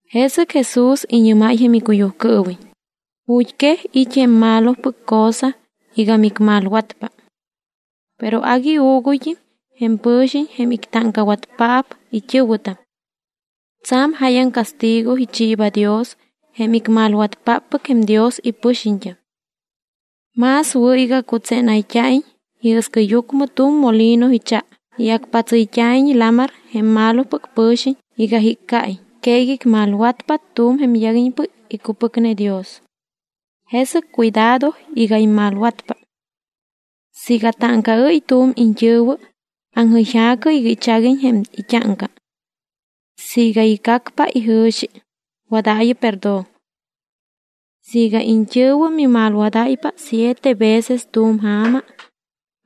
Jesɨc Jesús iñɨ́máy icuyujcɨɨwiñ: —Ju̱t́quej it́ jém malopɨc cosa iga micmalwatpa. Pero agui uuguyt́im jém pɨ̱xiñ jém ictáŋcawatpaap it́ɨ̱wɨtam. Tsa̱m jáyaŋ castigo ichiiba Dios jém icmalwatpáppɨc jém Dios ipɨxiñt́am. Más wɨ̱ iga cutsénayt́a̱iñ iɨscɨyucmɨ tu̱m molino icha y acpatsɨyt́a̱iñ lamar jém malopɨc pɨ̱xiñ iga jiccaiñ que iga icmalwatpa tu̱m jém yaguiñpɨc icupɨcne Dios. Jesɨc cuidado iga immalwatpa. ’Siiga táŋcaɨ́y tu̱m iñt́ɨ̱wɨ, aŋjɨyja̱cɨ iga ichaguiñ jém it́áŋca. Siiga icacpa ijɨ̱xi, wadaayɨ perdón. Siiga iñt́ɨ̱wɨ mimalwadáypa siete veces tu̱m ja̱ma,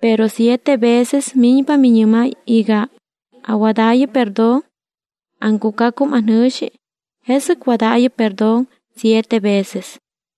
pero siete veces miñpa miñɨ́máy iga: “Awadaayɨ perdón, aŋcucacum anjɨ̱xi”, jesɨc wadaayɨ perdón siete veces.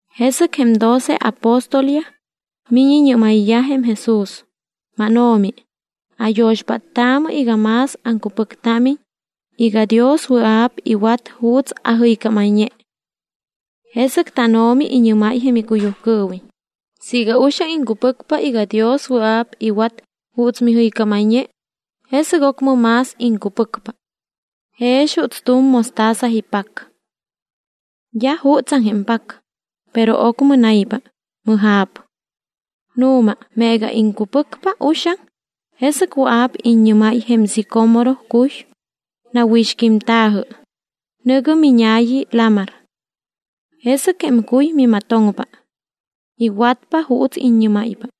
Jesɨc jém doce apóstolyaj miñ iñɨ́mayyaj jém Jesús: —MánO̱mi, ayo̱xpáttaamɨ iga más aŋcupɨctámiñ iga Dios wɨa̱p iwat juuts ajɨycámayñe. Jesɨc tánO̱mi iñɨ́máy icuyujcɨɨwiñ: —Siiga uxaŋ iŋcupɨcpa iga Dios wɨa̱p iwat juuts mijɨycámayñe, jesɨc ocmɨ más iŋcupɨcpa. Jex juuts tu̱m mostaza ipac. D́a jutsaŋ jém pac, pero ocmɨ naypa, mɨja̱p. Nu̱ma meega iŋcupɨcpa uxaŋ, jesɨc wɨa̱p iññɨ́máy jém sicómoro cuy: “Nawixquímta̱jɨ, nɨ̱gɨ miña̱yi lamar.” Jesɨc jém cuy mimatoŋpa. Iwatpa juuts iññɨ́máypa.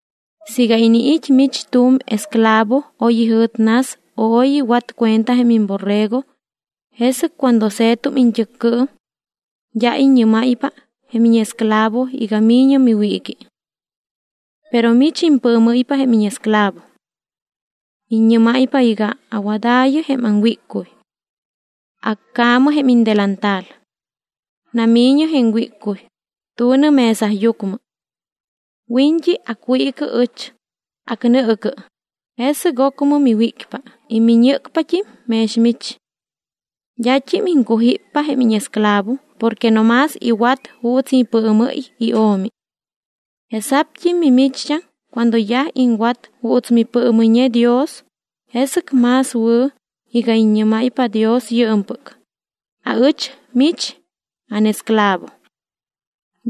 ’Siiga iniit́ mich tu̱m esclavo oy ijɨ̱t nas o oy iwat cuenta jém imborrego, jesɨc cuando se̱tum iñt́ɨccɨɨm, d́a iññɨ́máypa jém íñesclavo iga mi̱ñɨ miwiiqui. Pero mich impɨɨmɨ́ypa jém íñesclavo. Iññɨ́máypa iga: “Awadaayɨ jém aŋwíccuy. Accaamɨ jém indelantal. Nami̱ñɨ jém wíccuy, tu̱nɨ mesayucmɨ. Wiñt́i acwiicɨ ɨch, acnɨɨcɨ, jesɨc ocmɨ miwícpa y miñɨ́cpat́im mex mich.” D́at́im iŋcujíppa jém íñesclavo porque no más iwat juuts ipɨɨmɨ́y io̱mi. Jesa̱pt́im mimicht́am cuando yaj iŋwat juuts mipɨɨmɨyñe Dios, jesɨc más wɨ̱ iga iññɨ́máypa Dios yɨɨmpɨc: “Aɨch mich ánesclavo.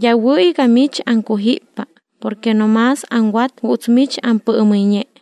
D́a wɨ̱ iga mich aŋcujíppa porque no más aŋwat juuts mich ampɨɨmɨyñe.”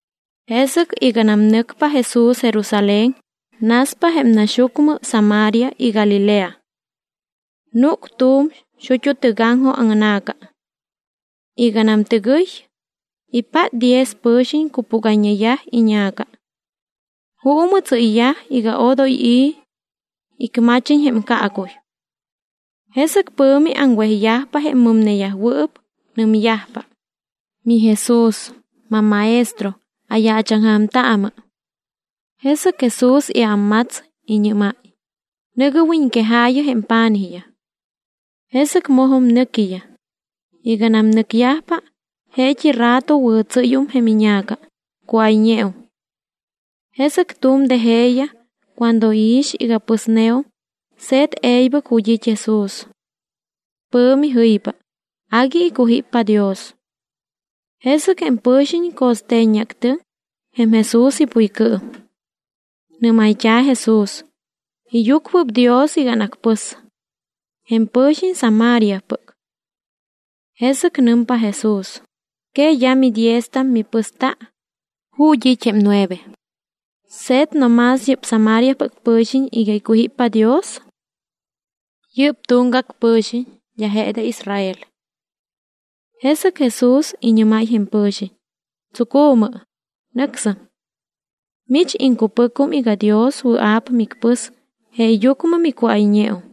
Jesɨc iganam nɨcpa Jesús Jerusalén, naspa jém naxyucmɨ Samaria y Galilea. Núc tu̱m xut́u tɨgaŋjoj aŋna̱ca. Iganam tɨgɨy, ipát diez pɨ̱xiñ cupúgayñeyaj iña̱ca. Juumɨ tsɨ́yyaj iga odoy i̱ icmachiñ jém caacuy. Jesɨc pɨ̱mi aŋwejyajpa jém mɨmneyajwɨɨp, nɨmyajpa: —MiJesús, mamMaestro, ayaachaŋja̱mtaamɨ. Jesɨc Jesús iámmats, iñɨ́máy: —Nɨ̱gɨ wiñquejaayɨ jém pa̱nijyaj. Jesɨc mojum nɨquiyaj. Iganam nɨcyajpa, jeet́i rato wɨ̱tsɨ́yum jém iña̱ca, cuáyñeum. Jesɨc tu̱m de jeeyaj cuando iix iga pɨsneum, se̱t e̱ybɨc ju̱t́ it́ Jesús. Pɨ̱mi jɨypa, agui icujíppa Dios. Jesɨc jém pɨ̱xiñ co̱ste̱ññeactɨŋ jém Jesús ipuycɨɨm. Nɨ́mayt́a̱ Jesús: “Iyucuɨpdios iga anacpɨs.” Jém pɨ̱xiñ Samariapɨc. Jesɨc nɨmpa Jesús: —¿Que d́a midieztam mipɨsta? ¿Ju̱t́ it́ jém nueve? ¿Se̱t no más yɨ́p Samariapɨc pɨ̱xiñ iga icujíppa Dios? Yɨ́p tuŋgac pɨ̱xiñ, d́a je de Israel. Jesɨc Jesús iñɨ́máy jém pɨ̱xiñ: —Tsucu̱mɨ, nɨcsɨm. Mich iŋcupɨcum iga Dios wɨa̱p micpɨs jeeyucmɨ micuáyñeum.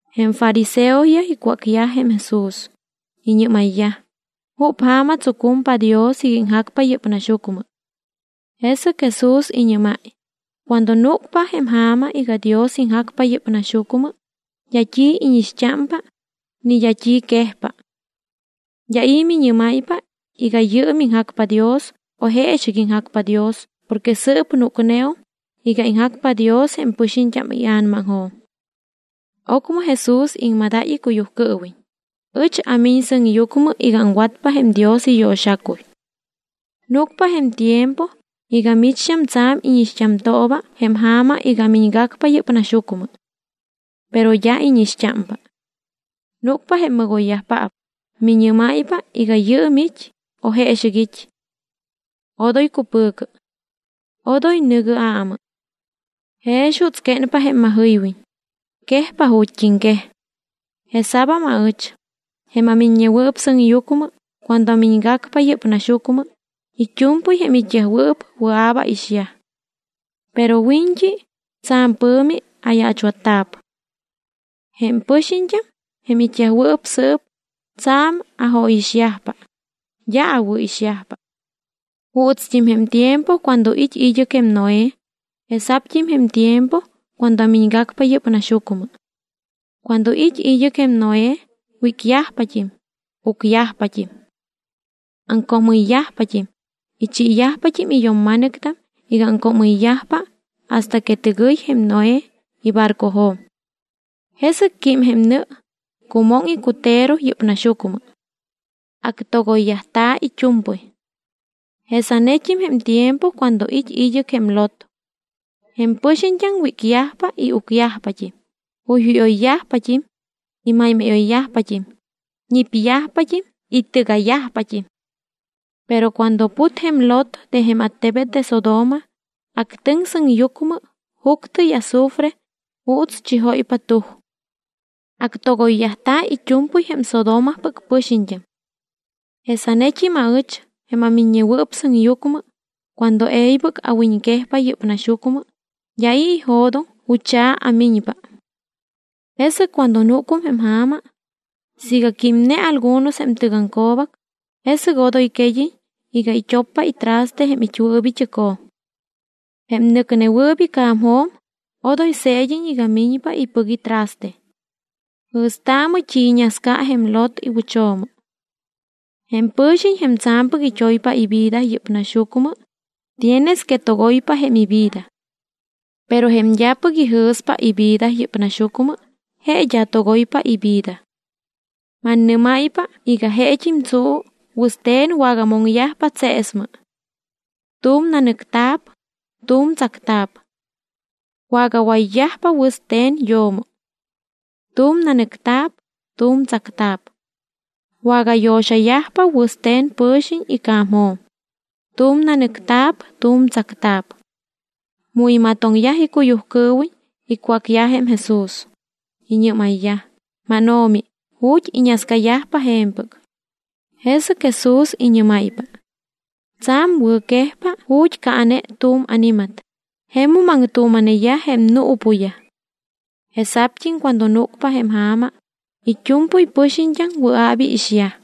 Jém fariseoyaj icwácyaj jém Jesús: Iñɨ́mayyaj: —¿Jup ja̱ma tsucumpa Dios iga iŋjacpa yɨ́p naxyucmɨ? Jesɨc Jesús iñɨ́máy: —Cuando núcpa jém ja̱ma iga Dios iŋjacpa yɨ́p naxyucmɨ d́a t́i íñixt́ámpa ni d́a t́i quejpa. D́a i̱ miñɨ́máypa iga yɨɨm iŋjacpa Dios o jeexɨc iŋjacpa Dios porque sɨɨp núcneum iga iŋjacpa Dios jém pɨxiñt́am ia̱namaŋjo̱m. Ocmɨ Jesús iŋmadáy icuyujcɨɨwiñ: —Ɨch amiñ sɨŋyucmɨ iga aŋwatpa jém Dios iyo̱xacuy. Núcpa jém tiempo iga micht́am tsa̱m íñixt́amtooba jém ja̱ma iga amiñgacpa yɨ́p naxyucmɨ. Pero d́a íñixt́ámpa. Núcpa jém mɨgoyyajpaap, miñɨ́máypa iga yɨɨm it́ o jeexɨc it́. Odoy cupɨ̱cɨ. Odoy nɨ̱gɨ aamɨ. Jex juuts quénpa jém majɨywiñ, quejpa ju̱t́iŋquej. Jesa̱bam aɨch, jém aMiññewɨɨp Sɨŋyucmɨ, cuando amiñgacpa yɨ́p naxyucmɨ, it́u̱mpɨy jém it́yajwɨɨp wɨa̱p aixyaj. Pero wiñt́i tsa̱m pɨ̱mi ayaachwatta̱p. Jém pɨxiñt́am, jém it́yajwɨɨp sɨɨp, tsa̱m ajóyixyajpa; d́a awɨ̱ixyajpa. Juutst́im jém tiempo cuando it́ id́ɨc jém Noé, jesa̱pt́im jém tiempo cuando amiñgacpa yɨ́p naxyucmɨ. Cuando it́ id́ɨc jém Noé, wícyajpat́im, ucyajpat́im. Aŋcoomɨyyajpat́im, ichiiyajpat́im iyo̱mma̱nɨctam iga aŋcoomɨyyajpa hasta que tɨgɨy jém Noé ibarcojo̱m. Jesɨc quím jém nɨ, cumoŋ icutero yɨ́p naxyucmɨ. Actogoyyajta̱ it́u̱mpɨy. Jesanet́im jém tiempo cuando it́ id́ɨc jém Lot. Jém pɨxiñt́am wícyajpa y ucyajpat́im, juyjúyoyyajpat́im y máymáyoyyajpat́im, ñipyajpat́im y tɨga̱yajpat́im. Pero cuando put jém Lot de jém attebet de Sodoma, actɨŋ sɨŋyucmɨ juctɨ y azufre juuts chijóypa tuj. Actogoyyajta̱ it́u̱mpɨy jém Sodomapɨc pɨxiñt́am. Jesanet́im aɨch jém aMiññewɨɨp Sɨŋyucmɨ cuando e̱ybɨc awiñquejpa yɨ́p naxyucmɨ, d́a i̱ ijo̱doŋ jucha̱ amiñpa. ’Jesɨc cuando núcum jém ja̱ma, siiga químne algunos jém tɨgaŋco̱bac, jesɨc odoy qued́iñ iga it́oppa itraste jém it́wɨɨp it́ɨcjo̱m. Jém nɨcnewɨɨp ica̱mjo̱m odoy se̱d́iñ iga miñpa ipɨc itraste. Jɨ̱staamɨ t́i iñasca jém Lot iwɨcho̱mo. Jém pɨ̱xiñ jém tsa̱mpɨc it́oypa ivida yɨ́p naxyucmɨ tienes que togoypa jém ivida. Pero jém d́apɨc ijɨ̱spa ivida yɨ́p naxyucmɨ, je d́a togoypa ivida. ’Mannɨ́máypa iga jeet́im tsuu, wɨste̱n wagamoŋyajpa tseesmɨ. Tu̱m nanɨcta̱p, tu̱m tsacta̱p. Wagawayyajpa wɨste̱n yo̱mo. Tu̱m nanɨcta̱p, tu̱m tsacta̱p. Wagayo̱xayajpa wɨste̱n pɨ̱xiñ ica̱mjo̱m. Tu̱m nanɨcta̱p, tu̱m tsacta̱p. Mu imatoŋyaj icuyujcɨɨwiñ icwácyaj jém Jesús. Iñɨ́mayyaj: —¿MánO̱mi, ju̱t́ iñascayajpa je̱mpɨc? Jesɨc Jesús iñɨ́máypa: —Tsa̱m wɨ̱quejpa ju̱t́ caane tu̱m ani̱mat, jemum aŋtuuma̱neyaj jém nuupuyaj. Jesa̱pt́im cuando núcpa jém ja̱ma, it́u̱mpɨy pɨxiñt́am wɨa̱p iixyaj.